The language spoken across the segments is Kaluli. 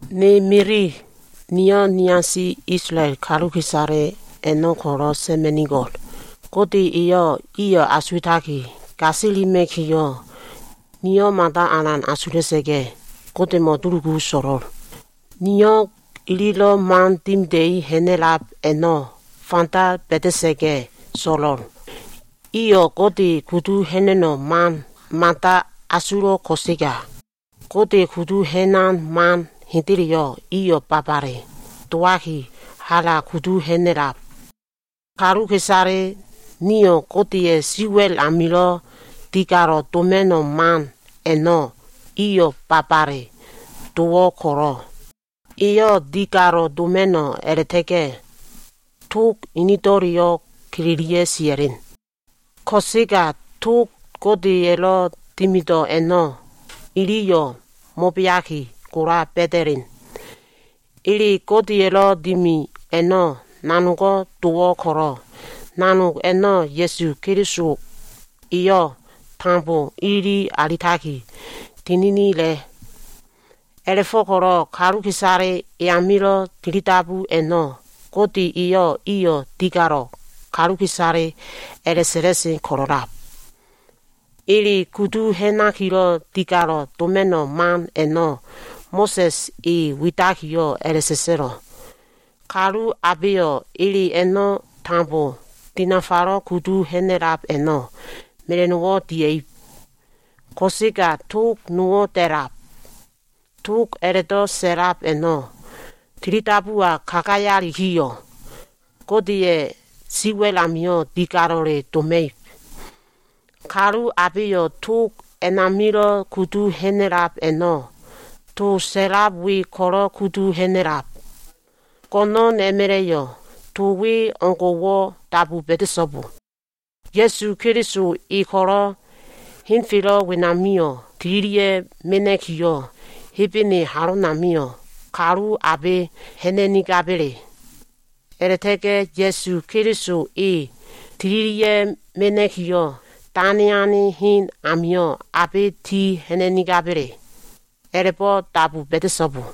Ne mili, niyo꞉ niasi Isolael kaluka꞉isale a꞉no꞉ ko꞉lo꞉ sa꞉ma꞉nigo꞉l. Gode eyo꞉ iyo꞉ asuwa꞉taki gasilima꞉kiyo꞉, niyo꞉ mada alan asula꞉sa꞉ga꞉, Godemo꞉ dulugu so꞉lo꞉l. Niyo꞉ ililo꞉ man dimida꞉i ha꞉na꞉lab a꞉no꞉ fanda ba꞉da꞉sa꞉ga꞉ so꞉lo꞉l. Iyo꞉ Gode kudu ha꞉na꞉no꞉ mada asulo꞉ ko꞉sega, Gode kudu ha꞉nan man hendeleyo꞉ iyo꞉ babale dowaki, hala kudu ha꞉na꞉lab. Kaluka꞉isale nio꞉ Godeya꞉ siwa꞉l amilo꞉ digalo꞉ doma꞉no꞉ man a꞉no꞉ iyo꞉ babale dowo꞉ ko꞉lo꞉, iyo꞉ digalo꞉ doma꞉no꞉ a꞉la꞉ta꞉ga꞉ tog inido꞉leyo꞉ kelelia꞉ sia꞉len. Ko꞉sega tog Godeya꞉lo꞉ dimido꞉ a꞉no꞉ iliyo꞉ mo꞉beaki gola ba꞉da꞉len. Ele Godeya꞉lo꞉ dimi a꞉no꞉ nanogo꞉ dowo꞉ ko꞉lo꞉, nanog a꞉no꞉ Ya꞉su Keliso eyo꞉ tambo ilili alitaki tininila꞉. A꞉la꞉fo꞉ko꞉lo꞉ kaluka꞉isale e amilo꞉ tilidabu a꞉no꞉ Gode eyo꞉ iyo꞉ digalo꞉ kaluka꞉isale a꞉la꞉sa꞉la꞉sen ko꞉lo꞉lab. Ele kudu ha꞉nakilo꞉ digalo꞉ doma꞉no꞉ man a꞉no꞉ Mo꞉sa꞉s e widakiyo꞉ a꞉la꞉sa꞉sa꞉lo꞉, “Kalu abeyo꞉ ele a꞉no꞉ tambo dinafalo꞉ kudu ha꞉na꞉lab a꞉no꞉, mela꞉no꞉wo꞉ dia꞉ib.” Ko꞉sega tog nowo꞉ da꞉lab. Tog a꞉la꞉do꞉ sa꞉lab a꞉no꞉ tilidabuwa kagayalikiyo꞉, Godeya꞉ siwa꞉l amio꞉ digalo꞉le doma꞉ib. Kalu abeyo꞉ tog a꞉namilo꞉ kudu ha꞉na꞉lab a꞉no꞉ to sa꞉lab we ko꞉lo꞉ kudu ha꞉na꞉lab. “Go꞉no꞉n a꞉ma꞉la꞉yo꞉ to we o꞉ngo꞉wo꞉ dabu ba꞉da꞉so꞉bo. ‘Ya꞉su Keliso e ko꞉lo꞉ henfelo꞉ wenamio꞉ tililia꞉ mena꞉kiyo꞉, Hebene halonamio꞉ kalu abe ha꞉na꞉nigaba꞉le?’ A꞉la꞉ta꞉ga꞉ Ya꞉su Keliso e tililia꞉ mena꞉kiyo꞉, ‘dane ane hen amio꞉ abe ti ha꞉na꞉nigaba꞉le’ a꞉la꞉bo꞉lo꞉ dabu ba꞉da꞉so꞉bo.”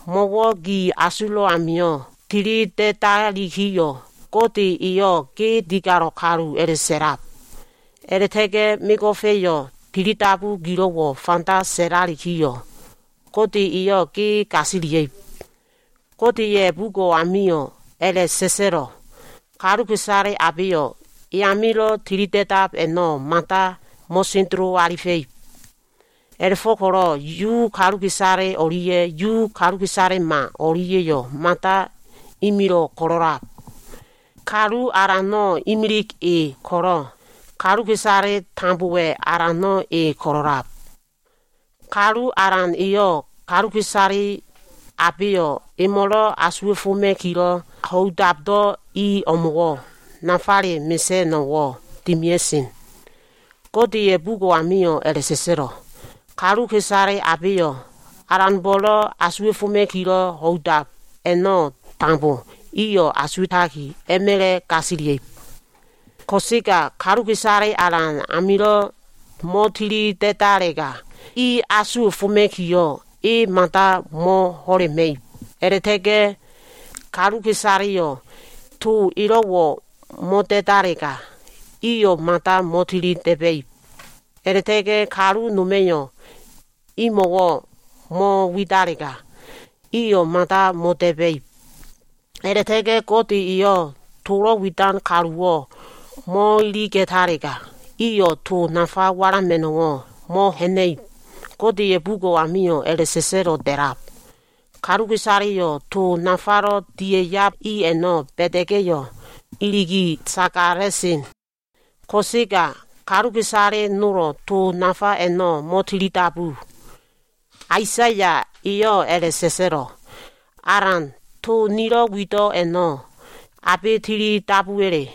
Mo꞉wo꞉ gi asulo꞉ amio꞉ tilida꞉dalikiyo꞉, Gode eyo꞉ ge digalo꞉ kalu a꞉la꞉sa꞉lab. A꞉la꞉ta꞉ga꞉ mego꞉fa꞉yo꞉ tilidabu gilo꞉wo꞉ fanda sa꞉lalikiyo꞉, Gode eyo꞉ ge gasiliab. Godeya꞉ bugo꞉ amio꞉ a꞉la꞉sa꞉sa꞉lo꞉, “Kaluka꞉isale abeyo꞉ e amilo꞉ tilida꞉dab a꞉no꞉ mada mo꞉sendelo alifa꞉ib.” A꞉la꞉fo꞉ko꞉lo꞉ Yu kaluka꞉isale o꞉lia꞉ Yu kaluka꞉isalema o꞉lia꞉yo꞉ mada imilo꞉ ko꞉lo꞉lab. Kalu Alano꞉ imilig e ko꞉lo꞉, kaluka꞉isale tambowa꞉ Alano꞉ e ko꞉lo꞉lab. Kalu Alan eyo꞉ kaluka꞉isale abeyo꞉ emo꞉lo꞉ asuwa꞉foma꞉kilo꞉ ho꞉idabdo꞉ i o꞉mo꞉wo꞉ nafale mesa꞉no꞉wo꞉ dimia꞉sen. Godeya꞉ bugo꞉ amio꞉ a꞉la꞉sa꞉sa꞉lo꞉, “Kaluka꞉isale abeyo꞉ Alanbo꞉lo꞉ asuwa꞉foma꞉kilo꞉ ho꞉idab a꞉no꞉ tambo, eyo꞉ asuwa꞉taki a꞉ma꞉la꞉ gasilia꞉ib.” Ko꞉sega kaluka꞉isale Alan amilo꞉ mo꞉tili da꞉dalega, i asuwa꞉foma꞉kiyo꞉ e mada mo꞉ho꞉lema꞉ib. A꞉la꞉ta꞉ga꞉ kaluka꞉isaleyo꞉ to elo꞉wo꞉ mo꞉da꞉dalega, iyo꞉ mada mo꞉tili da꞉ba꞉ib. A꞉la꞉ta꞉ga꞉ kalu noma꞉yo꞉ imo꞉wo꞉ mo꞉widalega, iyo꞉ mada mo꞉da꞉ba꞉ib. A꞉la꞉ta꞉ga꞉ Gode eyo꞉ tolo꞉ widan kaluwo꞉ mo꞉iliga꞉talega, iyo꞉ to nafa walama꞉no꞉wo꞉ mo꞉ha꞉na꞉ib. Godeya꞉ bugo꞉ amio꞉ a꞉la꞉sa꞉sa꞉lo꞉ da꞉lab, “Kaluka꞉isaleyo꞉ to nafalo꞉ dia꞉yab i a꞉no꞉ ba꞉da꞉ga꞉yo꞉, iligaki sagala꞉sen.” Ko꞉sega kaluka꞉isale nolo꞉ to nafa a꞉no꞉ mo꞉tilidabu. Aisaya eyo꞉ a꞉la꞉sa꞉sa꞉lo꞉, “Alan, to nilo꞉ wido꞉ a꞉no꞉ abe tili dabuwa꞉le?”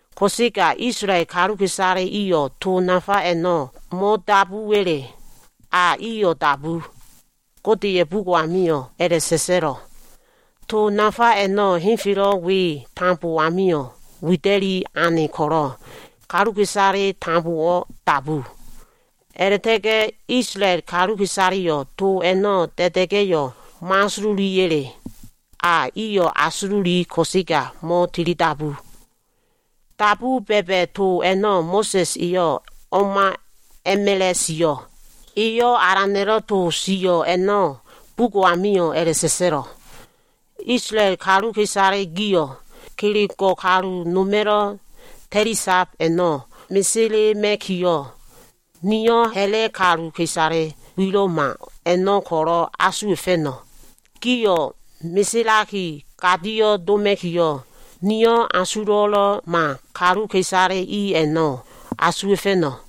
Ko꞉sega, Isolael kaluka꞉isale iyo꞉ to nafa a꞉no꞉ mo꞉dabuwa꞉le? A iyo꞉ dabu. Godeya꞉ bugo꞉ amio꞉ a꞉la꞉sa꞉sa꞉lo꞉, “To nafa a꞉no꞉ henfelo꞉ we tambo amio꞉ wida꞉li ane ko꞉lo꞉, kaluka꞉isale iliyo꞉ tambo dabu.” A꞉la꞉ta꞉ga꞉ Isolael kaluka꞉isaleyo꞉ to a꞉no꞉ da꞉da꞉ga꞉yo꞉ mo꞉asululiya꞉le? A iyo꞉ asululi ko꞉sega mo꞉tilidabu. Dabu ba꞉ba꞉ to a꞉no꞉ Mo꞉sa꞉s eyo꞉ o꞉ma a꞉ma꞉la꞉ sio꞉. Eyo꞉ Alana꞉lo꞉ to sio꞉ a꞉no꞉ bugo꞉ amio꞉ a꞉la꞉sa꞉sa꞉lo꞉, “Isolael kaluka꞉isale gio꞉, kelego꞉ kalu noma꞉lo꞉ ta꞉lisab a꞉no꞉ meselema꞉kiyo꞉, niyo꞉ ha꞉la꞉ kaluka꞉isale wilo꞉ma a꞉no꞉ ko꞉lo꞉ asuwa꞉fa꞉no꞉. Gio꞉ meselaki gadio꞉ doma꞉kiyo꞉, niyo꞉ asulo꞉lo꞉ma kaluka꞉isale i a꞉no꞉ asuwa꞉fa꞉no꞉.”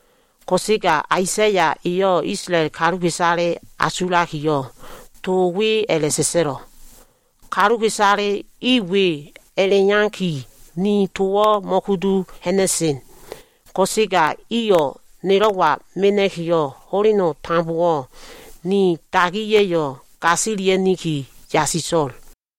Ko꞉sega Aisaya eyo꞉ Isolael kaluka꞉isale asulakiyo꞉, to we a꞉la꞉sa꞉sa꞉lo꞉, Kaluka꞉isale i we a꞉la꞉iyaki ni towo꞉ mo꞉kudu ha꞉na꞉sen. Ko꞉sega iyo꞉ nelo꞉wa mena꞉kiyo꞉ ho꞉leno꞉ tambowo꞉ ni dagiya꞉yo꞉ gasilia꞉niki yasiso꞉l.